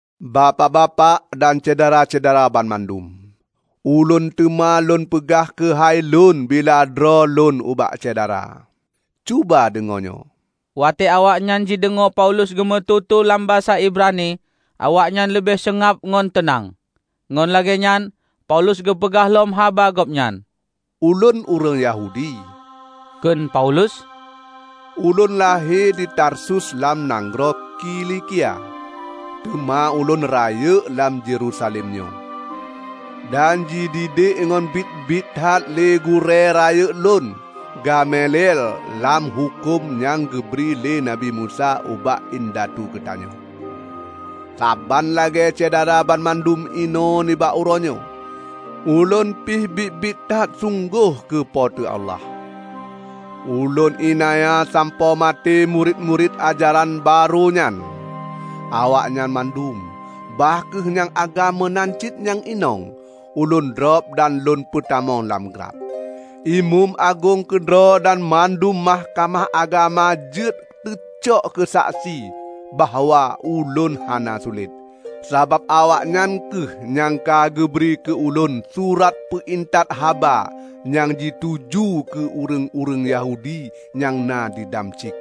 "Bapak-bapak dan syedara-syedara banmandum! Ulôn teuma lôn peugah keuhai lôn bila droe lôn ubak syedara. Cuba deungoe nyoe!" Watée awaknyan jideungoe Paulus geumeututoe lam basa Ibrani, awaknyan leubeh seungab ngon teunang. Ngon lagée nyan, Paulus geupeugah lom haba gobnyan. "Ulôn ureuëng Yahudi," kheun Paulus, "Ulôn lahé di Tarsus lam nanggroe Kilikia, teuma ulôn rayeuk lam Yerusalem nyoe, dan jididek ngon biet-biet that lé gurée rayeuk ulôn Gamaliel lam huköm nyang geubri lé Nabi Musa ubak indatu geutanyoe. Saban lagée syedara banmandum inoe nibak uroenyoe, ulôn pih biet-biet that sunggoh keu Po teu Allah. Ulôn iénanya sampoe maté murit-murit ajaran barô nyan. Awaknyan mandum, bah kheueh nyang agam meunan cit nyang inong, ulôn drob dan lôn peutamong lam glab. Imeum agong keudroe dan mandum Mahkamah Agama jeuet teucok keusaksi bahwa ulôn hana sulet. Sabab awaknyan kheueh nyang ka geubri keu ulôn surat peu intat haba nyang jituju keu ureuëng-ureuëng Yahudi nyang na di Damsyik.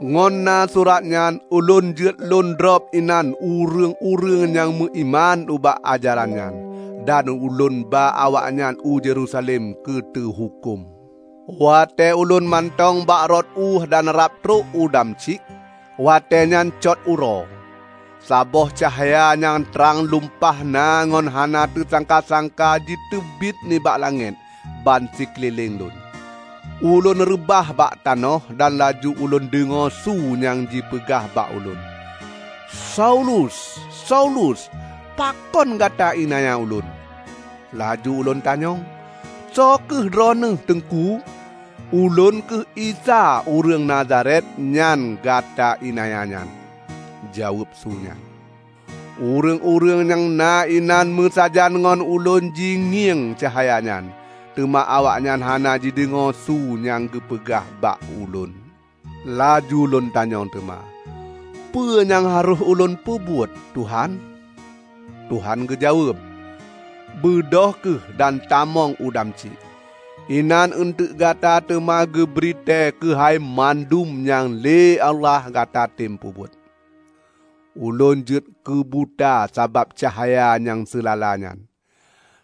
Ngon na surat nyan ulôn jeuet lôn drob inan ureuëng-ureuëng nyang meuiman ubak ajaran nyan, dan lôn ba awaknyan u Yerusalem keu teuhuköm." "Watée ulôn mantong bak rot euh dan rab trok u Damsyik, watée nyan cot uroe, saboh cahya nyang trang lumpah na ngon hana teusangka-sangka jiteubiet nibak langét ban sikeulileng lôn. Ulôn reubah bak tanoh dan laju ulôn deungoe su nyang jipeugah bak ulôn, 'Saulus, Saulus! Pakon gata iénanya Ulôn?' Laju ulôn tanyong, 'Soe kheueh Droeneueh, Teungku?' 'Ulôn kheueh Isa ureuëng Nazaret nyan nyang gata iénanya,' jaweueb su nyan. Ureuëng-ureuëng nyan na inan meusajan ngon ulôn jingieng cahya nyan, teuma awaknyan hana jideungoe su nyang geupeugah bak ulôn. Laju lôn tanyong teuma, 'Peue nyang harôh ulôn peubuet, Tuhan?' Tuhan geujaweueb, 'Beudôh kheueh dan tamong u Damsyik. Inan eunteuk gata teuma geubri tée keuhai mandum nyang lé Allah gatatem peubuet.' Ulôn jeuet keubuta sabab cahya nyang seulala nyan.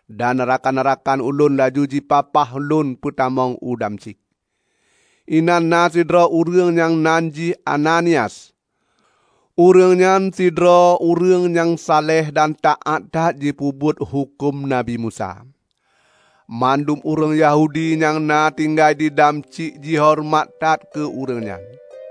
Dan rakan-rakan ulôn laju jipapah ulôn peutamong u Damsyik. Inan na sidroe ureuëng nyang nan jih Ananias. Ureuëng nyan sidroe ureuëng nyang saleh dan taát that jipeubuet huköm Nabi Musa. Mandum ureuëng Yahudi nyang na tinggai di Damsyik jihoreumat that keu ureuëng nyan.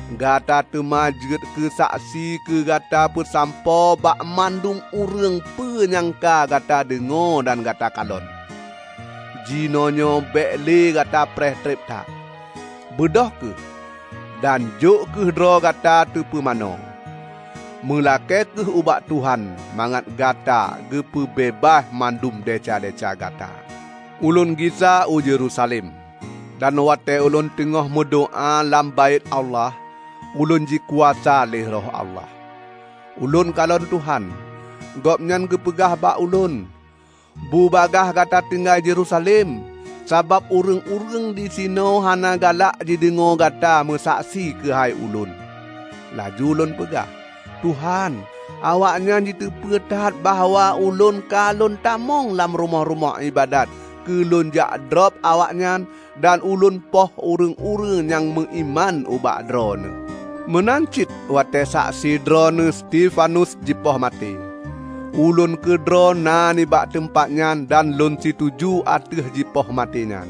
Gata teuma jeuet keu keusaksi keu gata peusampoe bak mandum ureuëng peue nyang ka gata deungoe dan gata kalon. Jinoenyoe bék le gata preh treb that. Beudôh kheueh, dan jok kheueh droe gata teupumanö. Meulakée kheueh ubak Tuhan mangat gata geupeu beubaih mandum desya-desya gata.' " "Ulôn gisa u Yerusalem, dan watée ulôn teungoh meudoá lam Baét Allah, ulôn jikuasa lé Roh Allah. Ulôn kalon Tuhan: Gobnyan geupeugah bak ulôn, 'Bubagaih gata tinggai Yerusalem, sabab ureuëng-ureuëng disinoe hana galak jideungoe gata meusaksi keuhai Ulôn.' Laju lôn peugah, 'Tuhan, awaknyan jiteupeu that bahwa ulôn ka lôn tamong lam rumoh-rumoh iébadat keu lôn jak drob awaknyan dan ulôn poh ureuëng-ureuëng nyang meuiman ubak Droeneueh. Meunan cit watée saksi Droeneueh Stefanus jipoh maté, ulôn keudroe na nibak teumpat nyan dan lôn situju ateueh jipoh maté nyan.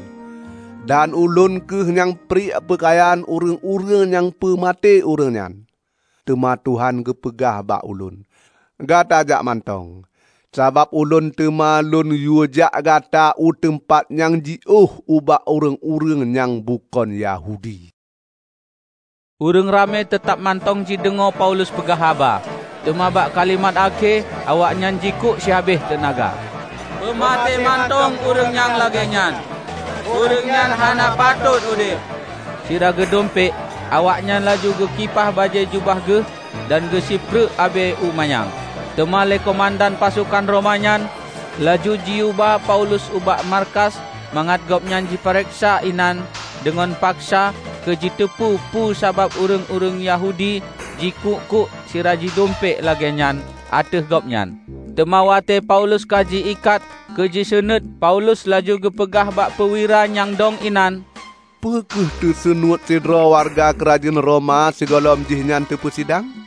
Dan ulôn kheueh nyang priek peukayan ureuëng-ureuëng nyang peumaté ureuëng nyan.' Teuma Tuhan geupeugah bak ulôn, 'Gata jak mantong, sabab ulôn teuma lôn yuejak gata u teumpat nyang jiôh ubak ureuëng-ureuëng nyang bukon Yahudi.' " Ureuëng ramé teutab mantong jideungoe Paulus peugah haba, teuma bak kalimat akhé awaknyan jikuk sihabéh teunaga, "Peumaté mantong ureuëng nyang lagée nyan. Ureuëng nyan hana patot udeb!" Sira geudumpék, awaknyan laju geukipah bajée jubah geuh, dan geusipreuek abée u manyang. Teuma lé keumandan pasokan Roma nyan laju jiyueba Paulus ubak markas mangat gobnyan jipareksa inan deungon paksa keu jiteupeu peue sabab ureuëng-ureuëng Yahudi jikuk-kuk sira jidumpék lagée nyan ateueh gobnyan. Teuma watée Paulus ka ji-ikat keu jiseunuét, Paulus laju geupeugah bak peuwira nyang dong inan, "Peu kheueh teusunuet sidroe wareuga keurajeuen Roma sigohlom jihnyan teupeusidang?"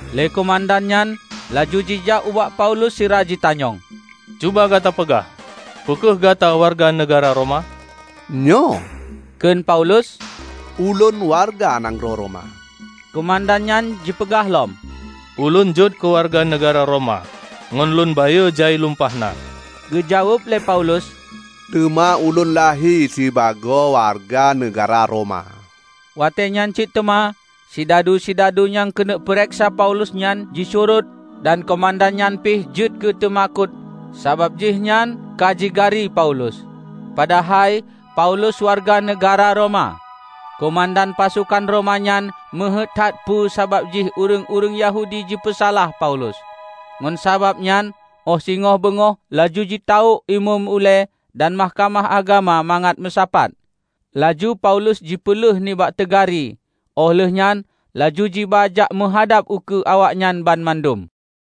Lé keumandan nyan laju jijak ubak Paulus sira jitanyong, "Cuba gata peugah, peu kheueh gata wareuga neugahra Roma!" "Nyoe," kheun Paulus, "Ulôn wareuga nanggroe Roma." Keumandan nyan jipeugah lom, "Ulôn jeuet keuwareuga neugahra Roma ngon lôn bayeue jai lumpah na!" Geujaweueb lé Paulus, "Teuma ulôn lahé sibagoe wareuga neugahra Roma." Watée nyan cit teuma sidadu-sidadu nyang keuneuk pareksa Paulus nyan jisurot dan keumandan nyan pih jeuet keuteumakot sabab jihnyan ka jigari Paulus, padahai Paulus wareuga neugahra Roma. Keumandan pasokan Roma nyan meuheuét that peue sabab jih ureuëng-ureuëng Yahudi jipeusalah Paulus. Ngon sabab nyan óh singoh beungoh laju jitawök Imeum ulée dan Mahkamah Agama mangat meusapat. Laju Paulus jipeuleueh nibak teugari, óh lheuehnyan laju jiba jak meuhadab ukeue awaknyan banmandum.